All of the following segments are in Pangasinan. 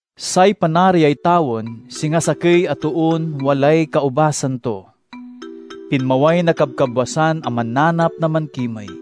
"Say Panariay tawen singa sakey a toon walay kaubasan to. Pinmaway na kabkabwasan a mananap na mankimey.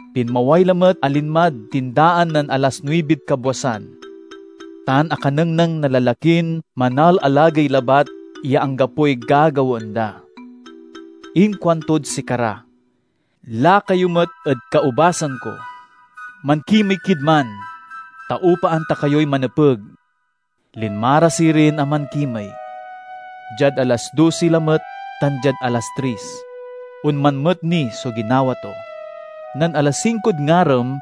Pinmaway lamet a linmad tindaan nen alas nuibid kabwasan, tan akanengneng na lalakin manalalagey labat ya anggapoy gagawaen da. Inkuantod sikara, 'Lakayo met ed kaubasan ko. Mankimey kid man, ta upaan ta kayoy manepeg.' Linma ra sirin a mankimey. Diad alas dosi lamet tan diad alas tris, onman met ni so ginawa to. Nen alas singkod ngarem,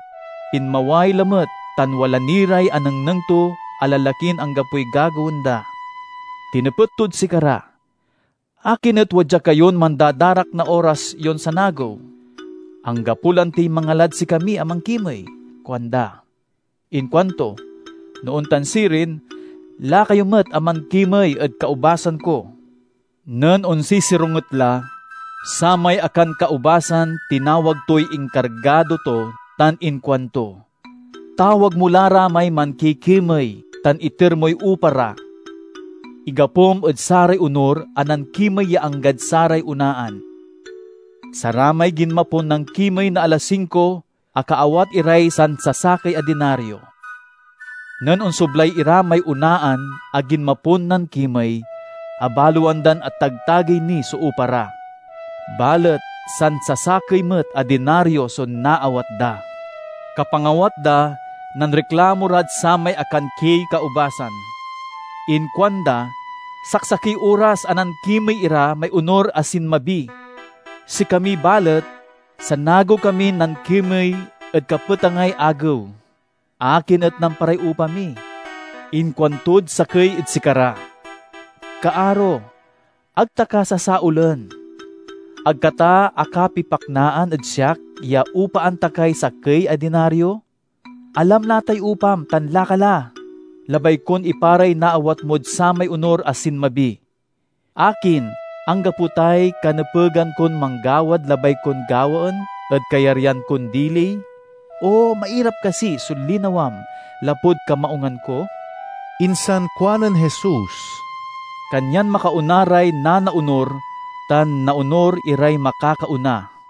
pinmaway lamet tan wala ni ray anengneng to a lalakin anggapoy gagawaen da. Tinepet tod sikara, 'Akin et wadya kayon mandadarak na oras yon sanagew?' 'Anggapo lantiy mangalad sikami a mankimey,' kuanda. Inkuanto, 'No ontan sirin, lakayo met a mankimey ed kaubasan ko!' "Nen onsisironget la, samay akankaubasan tinawag toy inkargado to tan inkuanto, 'Tawag mo la ra may mankikimey tan iter moy upa ra. Igapom ed saray onur a nankimey ya anggad saray onaan.' Saramay ginmapon nankimey na alas singko, akaawat iray sansasakey a dinario. Nen onsoblay ira may onaan a ginmapon nankimey, abaloan dan atagtagey ni so upa ra. Balet sansasakey met a dinario so naawat da. Kapangawat da, nanriklamo rad samay ankankiey kaubasan. Inkuanda, 'Saksakey oras a nankimey ira may onur a sinmabi; sikami, balet, sanagew kamin nankimey ed kapetangay agew. Akin et namparay upa mi?' Inkuantod sakey ed sikara, 'Kaaro, ag ta ka sasaolen. Ag ka ta akapipaknaan ed siak ya upaan ta kay sakey a dinario? Alam la tay upam tan laka la. Labay kon iparay naawat mod samay onur a sinmabi. Akin, anggapo tay kanepegan kon manggawad labay kon gawaen ed kayaryan kon dili? O mairap kasi so linawam lapud kamaungan ko?'" Insan kuanen Jesus, "Kanyan makaona ray nanaonur, tan naonur iray makakaona."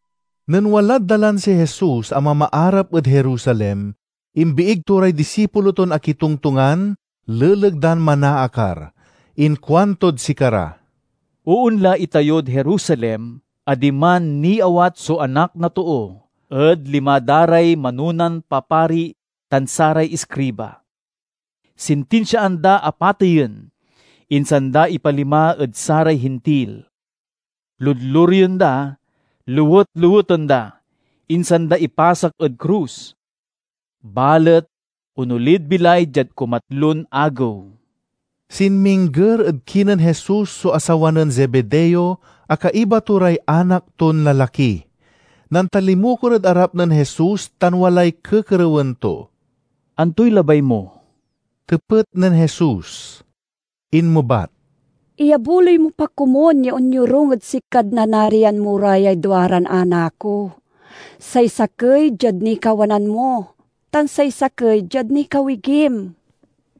Nen walad dalan si Jesus a mamaarap ed Jerusalem, imbiig to ray disipulo ton akitongtongan leleg dan manaakar. Inkuantod sikara, "Oonla itayod Jerusalem a diman niawat so Anak na Too ed lima da ray manonan papari tan saray iskriba. Sintinsiaan da a pateyen, insan da ipalima ed saray Hintil. Ludlureyen da, lewet-leweten da, insan da ipasak ed krus. Balet onolid bilay diad kumatlon agew." Sinmingger ed kinen Jesus so asawa nen Zebedeo a kaiba to ray anak ton lalaki. Nantalimukor ed arap nen Jesus tan walay kekerewen to. "Antoy labay mo?" tepet nen Jesus. Inmebat, "Iyabuloy mo pa komun ya onyorung ed sikad nanarian mo ra yay duaran anak ko, say sakey diad nikawanan mo tan say sakey diad nikawigim."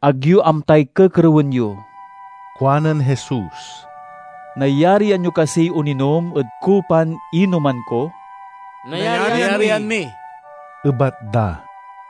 "Ag yo amtay kekerewen yo," kuanen Jesus. "Nayarian yo kasiy oninom ed kupan inoman ko?" "Nayarian mi," ebat da.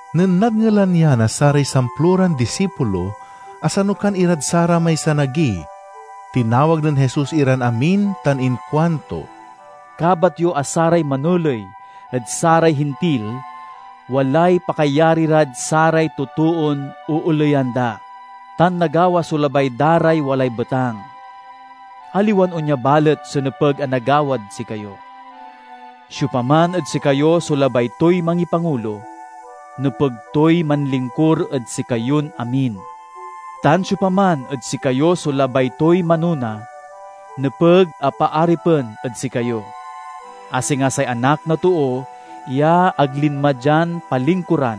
Nen nadngelan ya na saray samploran disipulo, asanukan irad saramay sanagi. Tinawag nen Jesus iran amin tan inkuanto, "Kabat yo a saray manoley ed saray Hintil walay pakayari rad saray totoon ooleyan da, tan nagawa so labay da ray walay betang. Aliwan onya balet so nepeg a nagawad sikayo. Siopaman ed sikayo so labay toy mangipangulo, nepeg toy manlingkur ed sikayon amin. Tan siopaman ed sikayo so labay toy manona, nepeg a paaripen ed sikayo, a singa say Anak na Too ya ag linma dian palingkuran,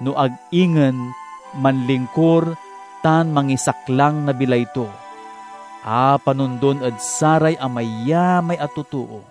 no ag ingen manlingkur tan mangisaklang na bilay to, a panondon ed saray amayamay a totoo."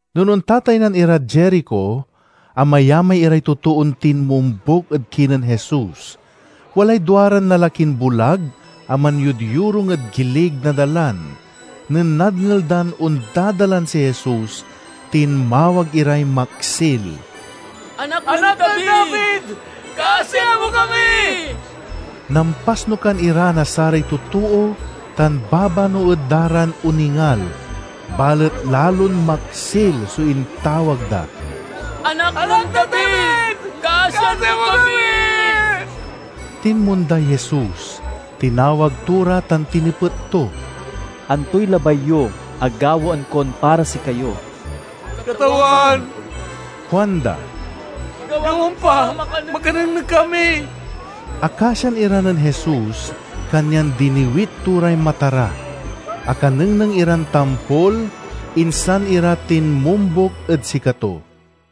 Nen ontataynan irad Jerico, amayamay iray totoon tinmombuk ed kinen Jesus. Walay duaran lalakin bulag a manyodyorung ed gilig na dalan. Nen nadngel dan ondadalan si Jesus tinmawag iray maksil, "Anak nen David, kasian mo kami!" Nampasnukan ira na saray totoo tan babanoed da ran oningal, balet lalon maksil so intawag da, "Anak nen David, kasian mo kami!" Tinmonday Jesus, tinawag to ra tan tinepet to, "Antoy labay yo a gawaen kon para sikayo?" "Katawan," kuanda, "gawam pa a makanengneng kami!" Akasian ira nen Jesus, kanyan diniwit to ray mata ra. Akanengneng iran tampol, insan ira tinmombuk ed sikato.